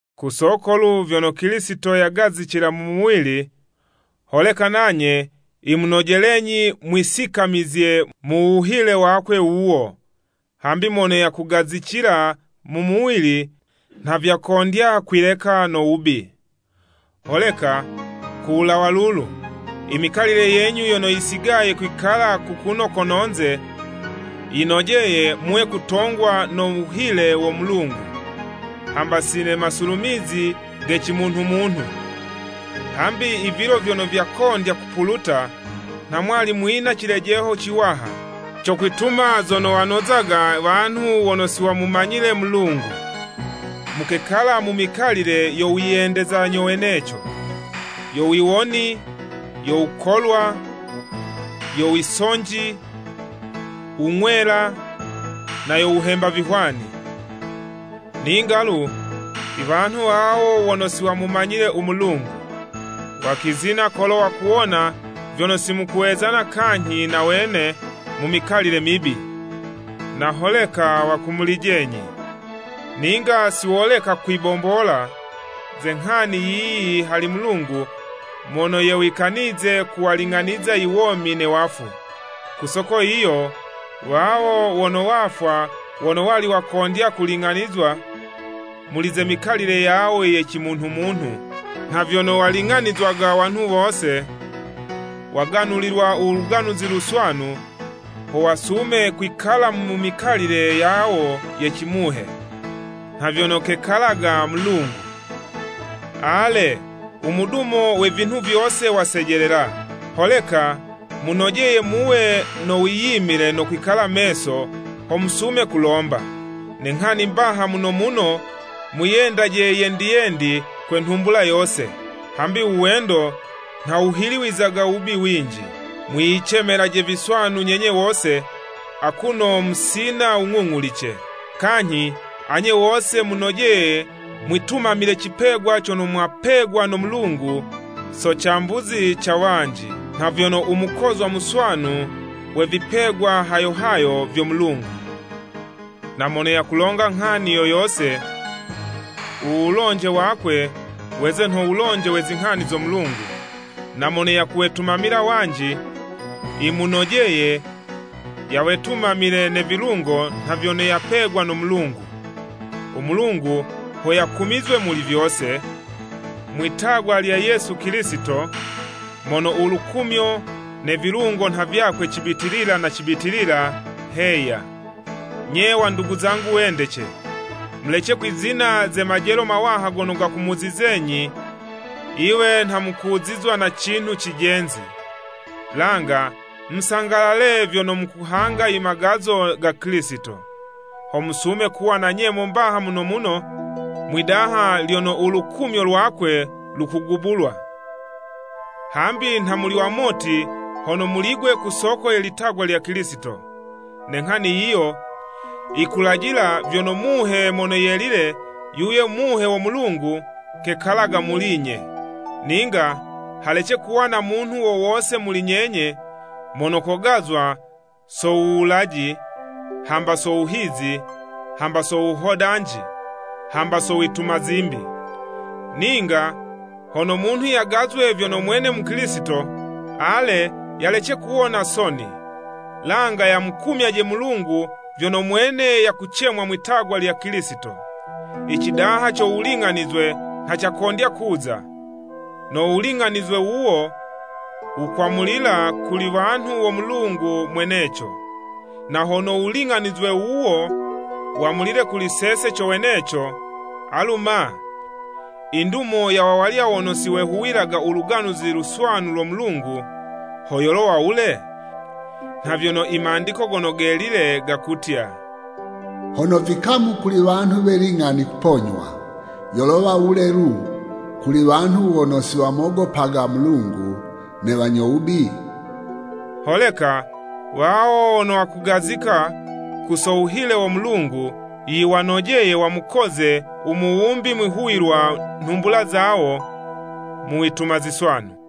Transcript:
Ku soko lu vyono Kilisito yagazicila mu muwili, holeka nanye yimunojelenyi mwisikamizizye mu wuhile wakwe wuwo, hambi mono yakugazicila mu muwili, nha vyakondya kwileka no wubi. Holeka ku wulawa lulu, imikalile yenyu yono yisigaye kwikala kukuno kono'nze, yinojeye muwe kutongwa no wuhile wo Mulungu, hamba si ne masulumizi ge cimunhu-munhu. Hambi i vilo vyono vyakondya kupuluta, nha mwali mwina cilejeho ciwaha, co kwituma zono wanozaga wanhu wono siwamumanyile Mulungu. Mukekala mu mikalile yo wiyendeza nyo weneco, yo wiwoni, yo wukolwa, yo wisonji, wung'wela, na yo wuhemba vihwani. Ninga'lu, iwanhu wawo wono siwamumanyile u Mulungu, wakwizina kolo wakuwona vyono simukuwezana kanyhi na wene mu mikalile mibi, na holeka wakumulijenyi. Ninga siwololeka kwibombola ze nghani yiyi hali Mulungu mono yewikanize kuwaling'aniza i womi ne wafu! Ku soko yiyo, wawo wono wafwa wono wali wakondya kuling'anizwa muli ze mikalile yawo ye cimunhu-munhu nha vyono waling'anizwaga wanhu wose, waganulilwa u Luganuzi Luswanu, ho wasume kwikala mu mikalile yawo ye cimuhe, nha vyono kekalaga Mulungu. Ale, u mudumo we vinhu vyose wasejelela. Holeka munojeye muwe no wiyimile no kwikala meso, ho musume kulomba. Ne nghani mbaha muno muno, mwiyendaje yendi-yendi kwe nhumbula yose, hambi uwendo nha wuhiliwizaga wubi winji. Mwiyicemelaje viswanu nyenye wose akuno musina wung'ung'ulice. Kanyhi anye wose munojeye mwitumamile cipegwa cono mwapegwa no Mulungu so cambuzi ca wanji, nha vyono u mukozwa muswanu we vipegwa hayo hayo vyo Mulungu. Na mono yakulonga nghani yo yose, u wulonje wakwe, weze nho wulonje we zinghani zo Mulungu, na mono yakuwetumamila wanji, yimunojeye yawetumamile ne vilungo nha vyono yakupegwa no Mulungu. U Mulungu ho yakumizwe muli vyose, mwitagwa lya Yesu Kilisito, mono ulukumyo ne vilungo nha vyakwe cibitilila na cibitilila! Heya. Nye wandugu zangu wendece, mulece kwizina ze majelo mawaha gono gakumuzizenyi yiwe nha mukuzizwa na cinhu cijenzi. Langa musangalale vyono mukuhanga imagazo ga Kilisito, ho musume kuwa na nyemo mbaha muno muno mwidaha lono ulukumyo lwakwe lukugubulwa. Hambi nha muli wamoti, hono muli'gwe ku soko ye litagwa lya Kilisito, ne nghani yiyo, yikulajila vyono Muhe Mono Yelile, yuyo Muhe wo Mulungu kekalaga muli'nye. Ninga halece kuwa na munhu wo wose muli nyenye mono kogazwa so wuwulaji, hamba so wuhizi, hamba so wuhodanji, hamba so wituma zimbi. Ninga hono munhu yagazwe vyono mwene Mukilisito, ale, yalece kuwona soni, langa yamukumyaje Mulungu vyono mwene yakucemwa mwitagwa lya Kilisito. I cidaha co wuling'anizwe nha cakondya kuza, no wuling'anizwe wuwo, wukwamulila kuli wanhu wo Mulungu mweneco. Na hono wulinga'nizwe wuwo wamulile kuli sese, co weneco, alu ma, i ndumo ya wawalya wono siwehuwilaga u Luganuzi Luswanu lo Mulungu, ho yolowa wule? Nha vyono i Mandiko Gono Gelile gakutya, “Hono vikamu kuli wanhu we ling'ani kuponywa, yolowa wule lu, kuli wanhu wono siwamogopaga Mulungu ne Wanyo wubi?” Holeka, wawo wono wakugazika ku so wuhile wo Mulungu, yiwanojeye, wamukoze u Muwumbi mwihuwilwa nhumbula zawo, mu wituma ziswanu.